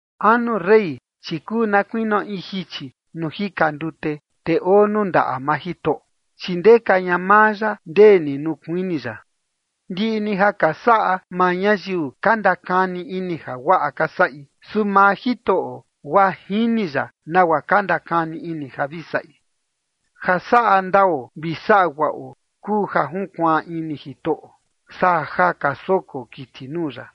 Anu rey, chi kuu na kuinio in jichi nuu jika ndute, te oo nuu ndaꞌa maa Jitoꞌo, chi ndeka ña maa ya ndee ni nuu kuini ya. Ndiꞌi ni ja ka saꞌa maa ñayiu ka ndakani ini ja guaꞌa ka saꞌi. Su maa Jitoꞌo, guaa jini ya nagua ka ndakani ini ja vi saꞌi. Ja saꞌa ndao vi saꞌa guaꞌo kuu ja junkuaan ini Jitoꞌo, saa ja ka soko kiti nuu ya.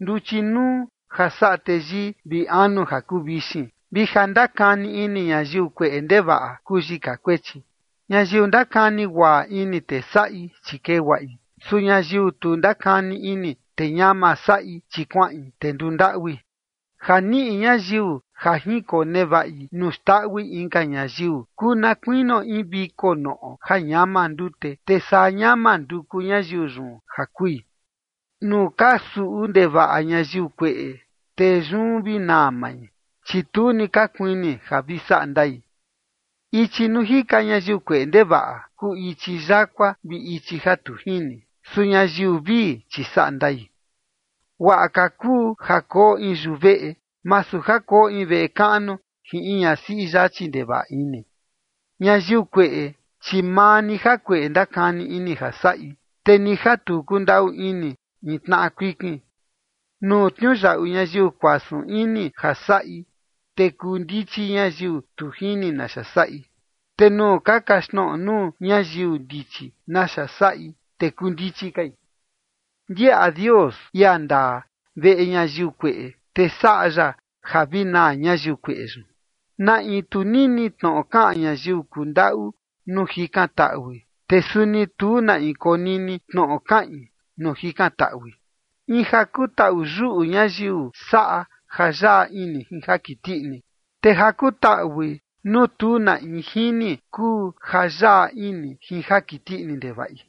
Nduchi nuu ja saꞌa teyii, vi anu ja kuu vixin, vi ja ndakani ini ñayiu kueꞌe ndevaꞌa kuu yika kuechi. Ñayiu ndakani guaꞌa ini, te saꞌi, chi kee guaꞌi. Su ñayiu tu ndakani ini, te ñama saꞌi, chi kuaꞌin, te nduu ndaꞌui. Ja niꞌi ñayiu ja jinkonevaꞌi nuu xndaꞌui inka ñayiu, kuu na kuinio in viko noꞌo ja ñama ndute, te saa ñama nduku ñayiu yun ja kui. Nuu ka suꞌu ndevaꞌa ñayiu kueꞌe, te yun vi naa mai, chi tu ni ka kuini ja vi saꞌa ndai. Ichi nuu jika ñayiu kueꞌe ndevaꞌa kuu ichi yakua vi ichi ja tu jini. Su ñayiu vii, chi saꞌa ndai. Guaꞌa ka kuu ja koo in yuveꞌe, masu ja koo in veꞌe kaꞌnu jin in ñasiꞌi yachi ndevaꞌa ini. Ñayiu kueꞌe, chi maa ni jakueꞌe ndakani ini ja saꞌi, te ni ja tu kundaꞌu ini in tnaꞌa kuikin. Nuu tniuyaꞌu ñayiu kuasun ini ja saꞌi, te kuu ndichi ñayiu tu jini naxa saꞌi, te nuu ka kaxtnoꞌo nuu ñayiu ndichi naxa saꞌi, te kuu ndichi kai. Ndiaꞌa Dios, ia ndaa, veꞌe ñayiu kueꞌe, te saꞌa ya ja vi naa ñayiu kueꞌe yun. Na in tu nini tnoꞌo kaꞌan ñayiu kundaꞌu nuu jikan taꞌui, te suni tu na in konini tnoꞌo kaꞌin nuu jikan taꞌui. In ja kutaꞌu yuꞌu ñayiu saꞌa ja yaꞌa ini jin ja kiti ini, te ja kutaꞌui nuu tu na in jini, kuu ja yaꞌa ini jin ja kiti ini ndevaꞌi.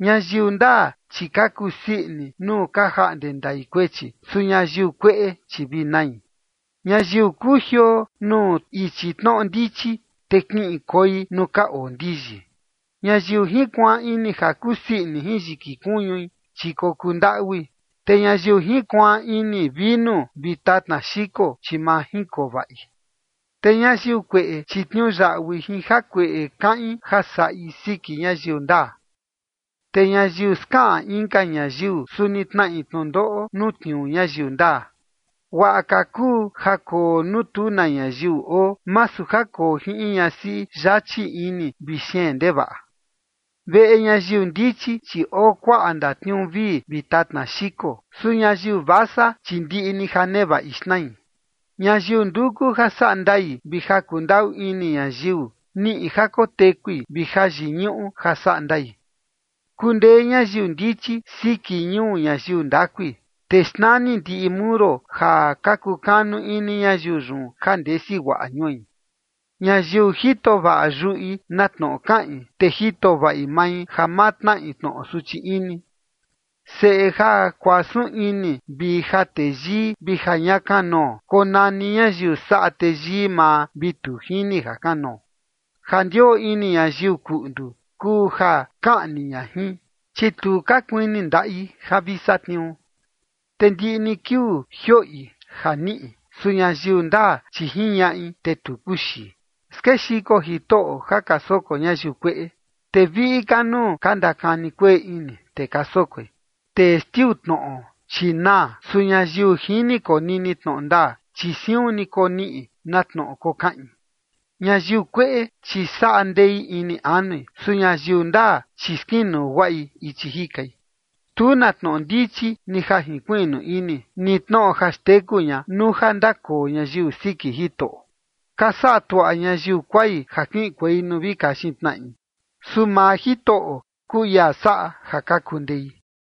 Ñayiu ndaa, chi ka kusii ini nuu ka jaꞌnde ndai kuechi. Su ñayiu kueꞌe, chi vi nai. Ñayiu kujioo nuu ichi tnoꞌo ndichi, te kiꞌin koi nuu ka oo ndiyi. Ñayiu jinkuaan ini ja kusii ini jin yiki kuñui, chi kokuu ndaꞌui, te ñayiu jinkuaan ini vinu vi tatna xiko, chi ma jinkoo vaꞌi. Te ñayiu kueꞌe, chi tniuyaꞌui jin jakueꞌe kaꞌin ja saꞌi siki ñayiu ndaa, te ñayiu skaꞌan inka ñayiu, suni tnaꞌi tnundoꞌo nuu tniuu ñayiu ndaa. Guaꞌa ka kuu ja koo nuu tu na ñayiu oo, masu ja koo jin in ñasiꞌi yachi ini vi xeen ndevaꞌa. Veꞌe ñayiu ndichi, chi oo kuaꞌa ndatniuu vii vi tatna xiko, su ñayiu vasa, chi ndiꞌi ni ja nevaꞌi xnai. Ñayiu nduku ja saꞌa ndai vi ja kundaꞌu ini ñayiu, niꞌi ja kotekui vi jayiñuꞌu ja saꞌa ndai. Kundee ñayiu ndichi siki ñuu ñayiu ndakui, te xnani ndiꞌi muro ja ka kukanu ini ñayiu yun ja ndesi guaꞌa ñui. Ñayiu jito vaꞌa yuꞌi na tnoꞌo kaꞌin, te jito vaꞌi mai ja ma tnaꞌi tnoꞌo suchi ini. Seꞌe ja kuasun ini vi ja teyii vi ja ña kanoo, konani ñayiu saꞌa teyii maa vi tu jini jakanoo. Ja ndioo ini ñayiu kuꞌndu kuu ja kaꞌni ña jin, chi tu ka kuini ndaꞌi ja vi satniuu. Te ndiꞌi ni kiuu jioꞌi ja niꞌi. Su ñayiu ndaa, chi jiñaꞌi, te tu kuxii. Skexiko Jitoꞌo ja ka soko ñayiu kueꞌe, te viꞌi ka nuu ka ndakani kueꞌe ini, te ka sokoi. Testiu tnoꞌo, chi naa. Su ñayiu jini konini tnoꞌo ndaa, chi siun ni koniꞌi na tnoꞌo kokaꞌin. Ñayiu kueꞌe, chi saꞌa ndei ini anui. Su ñayiu ndaa, chi skinuu guaꞌi ichi jikai. Tu na tnoꞌo ndichi, ni ja jinkuiꞌnu ini, ni tnoꞌo ja xteku ña nuu ja ndakoo ñayiu siki Jitoꞌo. Ka saꞌa tuaꞌa ñayiu kuai ja kiꞌinkuei nuu vi kaxin tnaꞌi. Su maa Jitoꞌo kuu ia saꞌa ja ka kundei.